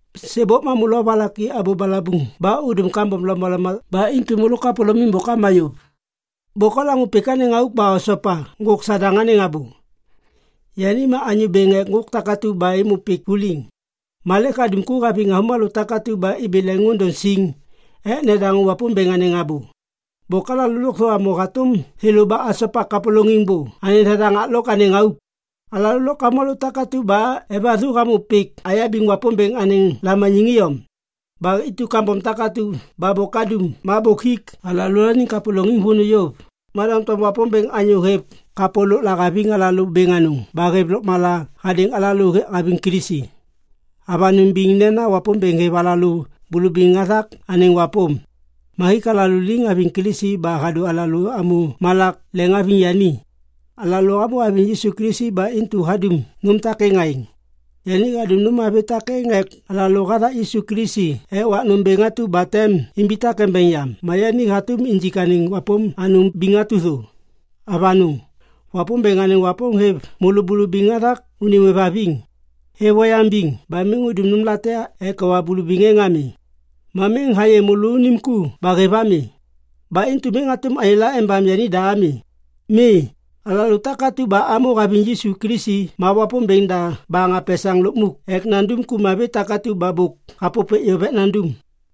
Sêbôk ma môlô ovalaki abô balabuŋ ba udum kambom lomaloma ba intu môlô kapôlômim bôk hama yôv. Bôk olaŋô pik anêŋ auk ba osopa ŋgôk Sadaŋ anêŋ abô. Yani ma anyô bêŋ ek ŋgôk takatu ba êmô pik vuliŋ. Ma lêk hadum ku haviŋ avômalô takatu ba ibi leŋôndôŋ siŋ ek nedaŋô Wapômbêŋ anêŋ abô. Bôk alalô lôkthô amô hatôm thêlô ba asopa kapôlôŋiŋ bô anêŋ thethaŋak lôk anêŋ auk. Alalô lôk avômalô takatu ba evathu hamô pik ayabiŋ Wapômbêŋ anêŋ lamaniŋ iyom. Ba intu kambom takatu ba bôk adum ma bôk hik alalôaniŋ kapôlôŋiŋ vônô yôv. Ma doŋtom Wapômbêŋ anyô hêv kapô lôk lahaviŋ alalô bêŋ anôŋ ba hêv lôkmala hadêŋ alalô haviŋ Kilisi. Avanôŋ biŋ nena Wapômbêŋ hêv alalô bulubiŋ hathak anêŋ wapôm. Ma hik alalô liŋ haviŋ Kilisi ba hadô alalô amô malak leŋ haviŋ yani. Alalô amô haviŋ Yisu Kilisi ba intu hadum nôm takêŋ aêŋ. Yani hadum nôm mavi takêŋ ek alalô hathak Yisu Kilisi ek wak nômbêŋ atu ba tem imbitak embeŋ yam ma yani hatôm injik anêŋ wapôm anôŋ biŋ atu thô. Avanôŋ, Wapômbêŋ anêŋ wapôm hêv môlô bulubiŋ hathak unim ôêvhaviŋ. Hêv oyaŋ biŋ ba miŋ udum nômlate ek owa bulubiŋ êŋ ami. Ma miŋ hayê môlô unim ku ba hêv ami. Ba intu miŋ hatôm anyôla embam yanida ami. Mi, alalô takatu ba amô haviŋ Yisu Kilisi ma Wapômbêŋ da baŋ hapesaŋ lukmuk ek nandum ku mavi takatu ba bôk hapôpêk yôv ek nandum.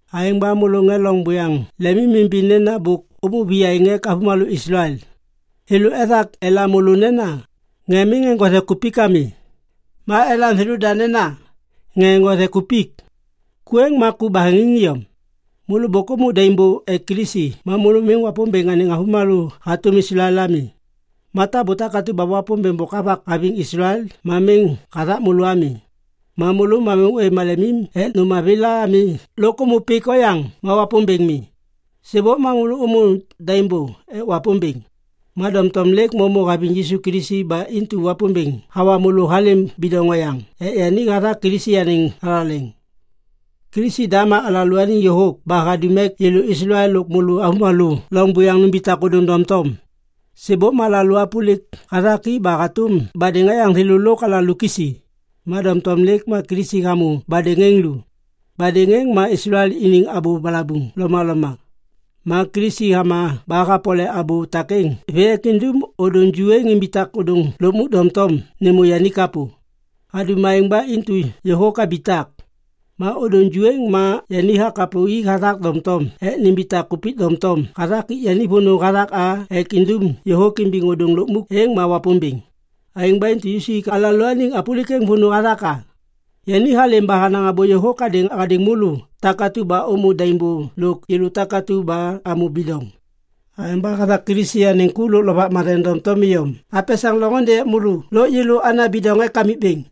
Aêŋ ba môlô ŋê loŋ buyaŋ lemimimbi nena bôk ômô viyaiŋ ek avômalô Islael. Thêlô ethak elam môlô nena, “Ŋê miŋ eŋgothe kupik ami”. Ma elam thêlôda nena, “Ŋê eŋgothe kupik”. Ku êŋ ma ku baheŋiŋ iyom. Môlô bôk ômô daimbô ek Kilisi ma môlô miŋ Wapômbêŋ anêŋ avômalô hatôm Islael ami. Ma tabô takatu ba Wapômbêŋ bôk havak haviŋ Islael ma miŋ hathak môlô ami. Ma môlô miŋ ôêv malemim ek nôm mavi la ami lôk ômô pik oyaŋ ma Wapômbêŋ mi. Sêbôk ma môlô ômô daimbô ek Wapômbêŋ, ma doŋtom lêk ômô haviŋ Yisu Kilisi ba intu Wapômbêŋ hawa môlô halêm bidoŋ oyaŋ ek yani hathak Kilisi anêŋ thalaleŋ. Kilisi da ma alalôaniŋ yôhôk ba hadum ek yêlô Islael lôk môlô avômalô loŋ buyaŋ nambitak ôdôŋ doŋtom. Sêbôk ma alalô apôlik hathak i ba hatôm badêŋ hayaŋ thêlô lôk alalô kisi, ma doŋtom lêk Kilisi hamô badêŋ êŋ lu. Badêŋ êŋ ma Islael iniŋ abô balabuŋ lomaloma. Ma Kilisi hama ba hapole abô takêŋ vê ek indum ôdôŋ ju êŋ nimbitak ôdôŋ lukmuk doŋtom nêmô yani kapô. Hadum aêŋ ba intu yôhôk habitak. Ma ôdôŋ ju êŋ ma yani hakapo i hathak doŋtom ek nimbitak kupik doŋtom hathak ik yani vônô hathak a ek indum yôhôk imbiŋ ôdôŋ lukmuk êŋ ma Wapômbêŋ. Aêŋ ba intu Yisu hik alalôaniŋ apôlik êŋ vônô hathak a. Yani halêm ba hanaŋ abô yôhôk hadêŋ môlô takatu ba ômô daimbô lôk yêlô takatu ba amô bidoŋ. Aêŋ ba hathak Kilisi anêŋ ku ma Lovak Matheŋ doŋtom iyom hapesaŋ loŋôndê ek môlô lôk yêlô ana bidoŋ ek Kamikbêŋ.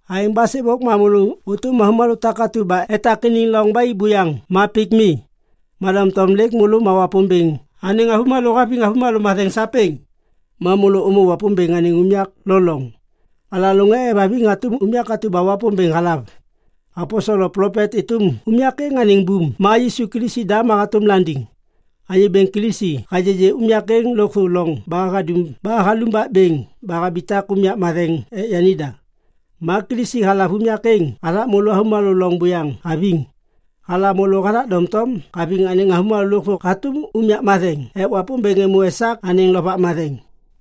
Aêŋ ba sêbôk ma môlô ôtôm avômalô takatu ba etak iniŋ loŋ ba i buyaŋ ma pik mi. Ma doŋtom lêk môlô ma Wapômbêŋ anêŋ loŋ lôkliŋyak anêŋ avômalô haviŋ avômalô matheŋ sapêŋ. Ma môlô ômô Wapômbêŋ anêŋ unyak lo loŋ. Alalô ŋê aêvhaviŋ hatôm unyak atu ba Wapômbêŋ halav. Aposel lo plopet êtôm unyak êŋ anêŋ bum ma Yisu Kilisi da ma hatôm landiŋ. Anyô Bêŋ Kilisi hagêgê unyak êŋ lôkthô loŋ ba hadum ba halumbak bêŋ ba habitak unyak matheŋ ek yanida. Ma Kilisi halav unyak êŋ hathak môlô avômalô loŋ buyaŋ haviŋ. Halav môlô hathak doŋtom haviŋ anêŋ avômalô lôkthô hatôm unyak matheŋ ek Wapômbêŋ êmô esak anêŋ Lovak Matheŋ.